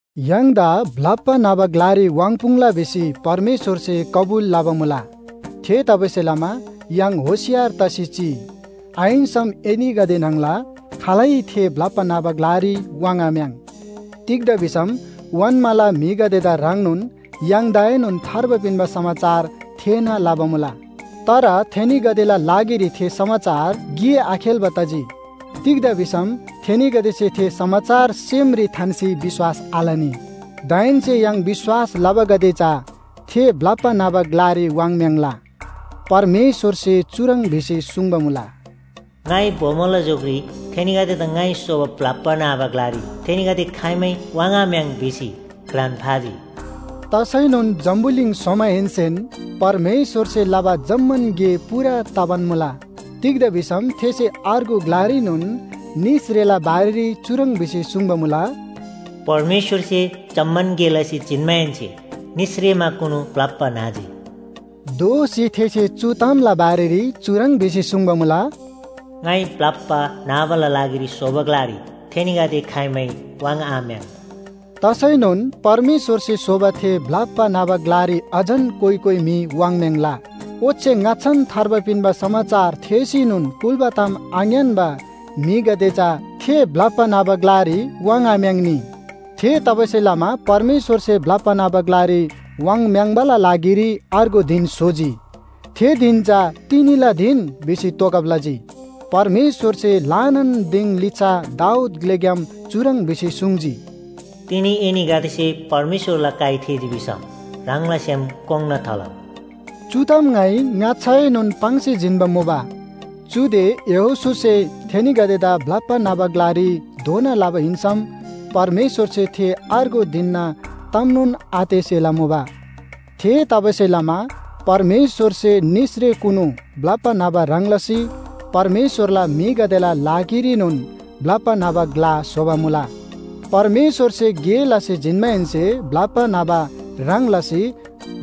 य्‍हाङदा ब्‍लप्‍बा न्‍हबा ग्‍लारी वाङ्‌पुङ्‌ला भिसी परमेश्‍वरसे कबुल लबा मुला। थेतबासेलमा य्‍हाङ होशियार तसी चिइ, आहिन्‍सम एनीगदे न्‍हङला खालै थे ब्‍लप्‍बा न्‍हबा ग्‍लारी वाङ्‌आम्‍याङ्। तिग्‍दा भिसम ओन्‍माला म्‍हिगदेदा ह्रङ्नोन य्‍हाङदाएनोन थार्बा पिन्‍बा समाचार थेःना लबा मुला। तर थेनीगदेला लागिरी थे समाचार गे आखेल्‍बा तजी। तिग्‍दा भिसम थेनीगदेसे थे समाचार सेमरी थान्‍सी विश्‍वास आलनी। दाहेन्‍से य्‍हाङ विश्‍वास लबागदे चा थे ब्‍लप्‍बा न्‍हबा ग्‍लारी वाङ्म्‍याङ्ला। परमेश्‍वरसे चुह्रङ् भिसी सुङ्बा मुला, “ङाइ बोमोला झोकरी ‘थेनीगदेदा ङाइ स्‍होबा ब्‍लप्‍बा न्‍हबा ग्‍लारी थेनीगदे खाइमै वाङ्‌आम्‍याङ्’ भिसी घ्रान फाजी।” तसैनोन जम्‍बुलिङ स्‍होमाहेन्‍सेन परमेश्‍वरसे लबा जम्‍मान गे पूरा तबान मुला। तिग्‍दा भिसम थेसे अर्गु ग्‍लारीनोन निसरेला बारेरी चुह्रङ् भिसी सुङ्बा मुला, “परमेश्‍वरसे जम्‍मान गे लसी जिन्‍माहेन्‍से निसरेमाकुनु ब्‍लप्‍बा न्‍हजी।” दोःसी थेसे चु तामला बारेरी चुह्रङ् भिसी सुङ्बा मुला, “ङाइ ब्‍लप्‍बा न्‍हबाला लागिरी स्‍होबा ग्‍लारी थेनीगदे खाइमै वाङ्‌आम्‍याङ्।” तसैनोन परमेश्‍वरसे स्‍होबा थे ब्‍लप्‍बा न्‍हबा ग्‍लारी अझन कोइ कोइ म्‍हि वाङ्‍म्‍याङ्‍‍ला। ओच्‍छे ङाच्‍छान थार्बा पिन्‍बा समाचार थेःसीनोन कुल्‍बा ताम आङ्‌यान्‍बा म्‍हिगदे चा थे ब्‍लप्‍बा न्‍हबा ग्‍लारी वाङ्‍आम्‍याङ्‍नी। थेतबासेलमा परमेश्‍वरसे ब्‍लप्‍बा न्‍हबा ग्‍लारी वाङ्‌म्‍याङ्बाला लागिरी अर्गु धिन स्‍होजी। थे धिन चा “तिनीला धिन” भिसी तोगब लजी। परमेश्‍वरसे ल्‍हानान दिङ लिच्‍छा दाऊद ग्‍लेग्‍याम चुह्रङ् भिसी सुङ्जी, “तिनी एनीगदेसे परमेश्‍वरला काइ थेःजी भिसम ह्राङला सेम कोङ्‌ना थालउ।” चु ताम ङाइ ङाच्‍छाएनोन पाङ्सी जिन्‍बा मुबा। चुदे यहोशूसे थेनीगदेदा ब्‍लप्‍बा न्‍हबा ग्‍लारी धोना लबा हिन्‍सम परमेश्‍वरसे थे अर्गु धिनना तामनोन आतेःसेला मुबा। थेतबासेलमा परमेश्‍वरसे निसरेकुनु ब्‍लप्‍बा न्‍हबा ह्रङ् लसी परमेश्‍वरला म्‍हिगदेला लागिरीनोन ब्‍लप्‍बा न्‍हबा ग्‍ला स्‍होबा मुला। परमेश्‍वरसे गे लसी जिन्‍माहेन्‍से ब्‍लप्‍बा न्‍हबा ह्रङ् लसी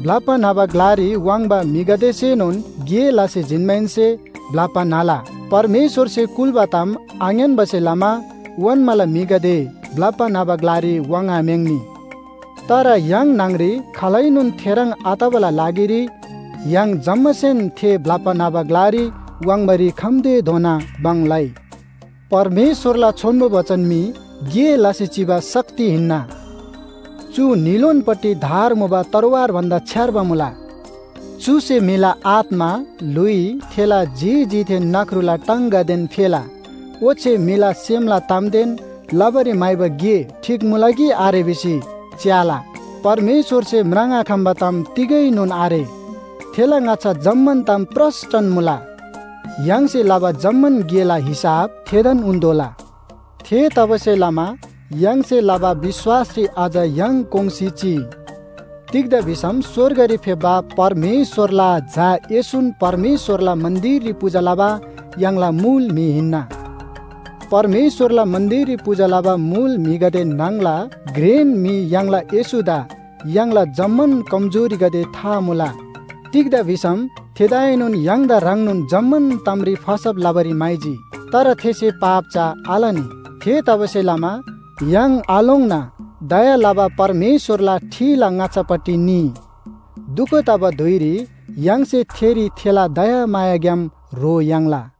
ब्‍लप्‍बा न्‍हबा ग्‍लारी वाङ्बा म्‍हिगदेसेनोन गे लसी जिन्‍माहेन्‍से ब्‍लप्‍बा न्‍हला। परमेश्‍वरसे कुल्‍बा ताम आङ्‌यान्‍बासे लमा ओन्‍माला म्‍हिगदे ब्‍लप्‍बा न्‍हबा ग्‍लारी वाङ्‌आम्‍याङ्‌नी। तर य्‍हाङ न्‍हङरी खालैनोन थेह्रङ् आतबाला लागिरी य्‍हाङ जम्‍मासेन थे ब्‍लप्‍बा न्‍हबा ग्‍लारी वाङ्बारी खम्‍तेधोना भङ लइ। परमेश्‍वरला छोन्‍बो बचन मी गे लसी चिबा शक्ति हिन्‍ना। चु न्‍हीलोनपट्टि धार मुबा तरवार भन्‍दा छ्‌यार्बा मुला। चुसे म्‍हिला आत्‍मा, ल्‍हुइ, थेला जी जीदेन नख्रुला टाङगदेन फेला ओच्‍छे म्‍हिला सेमला तामदेन लबारी म्‍हाइबा गे ठीक मुला कि आरे भिसी च्‍याला। परमेश्‍वरसे म्राङ्आखम्‍बा ताम तिगैनोन आरे। थेला ङाच्‍छा जम्‍मान ताम प्रस्‍टन मुला। य्‍हाङसे लबा जम्‍मान गेला हिसाब थेदान उन्‍तोःला। थेतबासेलमा य्‍हाङसे लबा विश्‍वासरी अझ य्‍हाङ कोङ्‌सी चिइ। तिग्‍दा भिसम स्‍वर्गरी फेप्‍बा परमेश्‍वरला झा येशून परमेश्‍वरला मन्‍दिररी पूजा लबा य्‍हाङला मुल म्‍हि हिन्‍ना। परमेश्‍वरला मन्‍दिररी पूजा लबा मुल म्‍हिगदे न्‍हङला घ्रेन म्‍हि य्‍हाङला येशूदा य्‍हाङला जम्‍मान कमजोरीगदे था मुला। तिग्‍दा भिसम थेदाएनोन य्‍हाङदा ह्रङ्नोन जम्‍मान तामरी फसब लबारी म्‍हाइजी। तर थेसे पाप चा आलनी। थेतबासेलमा य्‍हाङ आलोङ्ना दया लबा परमेश्‍वरला ठिला ङाच्‍छापट्टि निइ। दुख तबा धुइरी य्‍हाङसे थेरी थेला दयामायाग्‍याम ह्रो याङ्ला।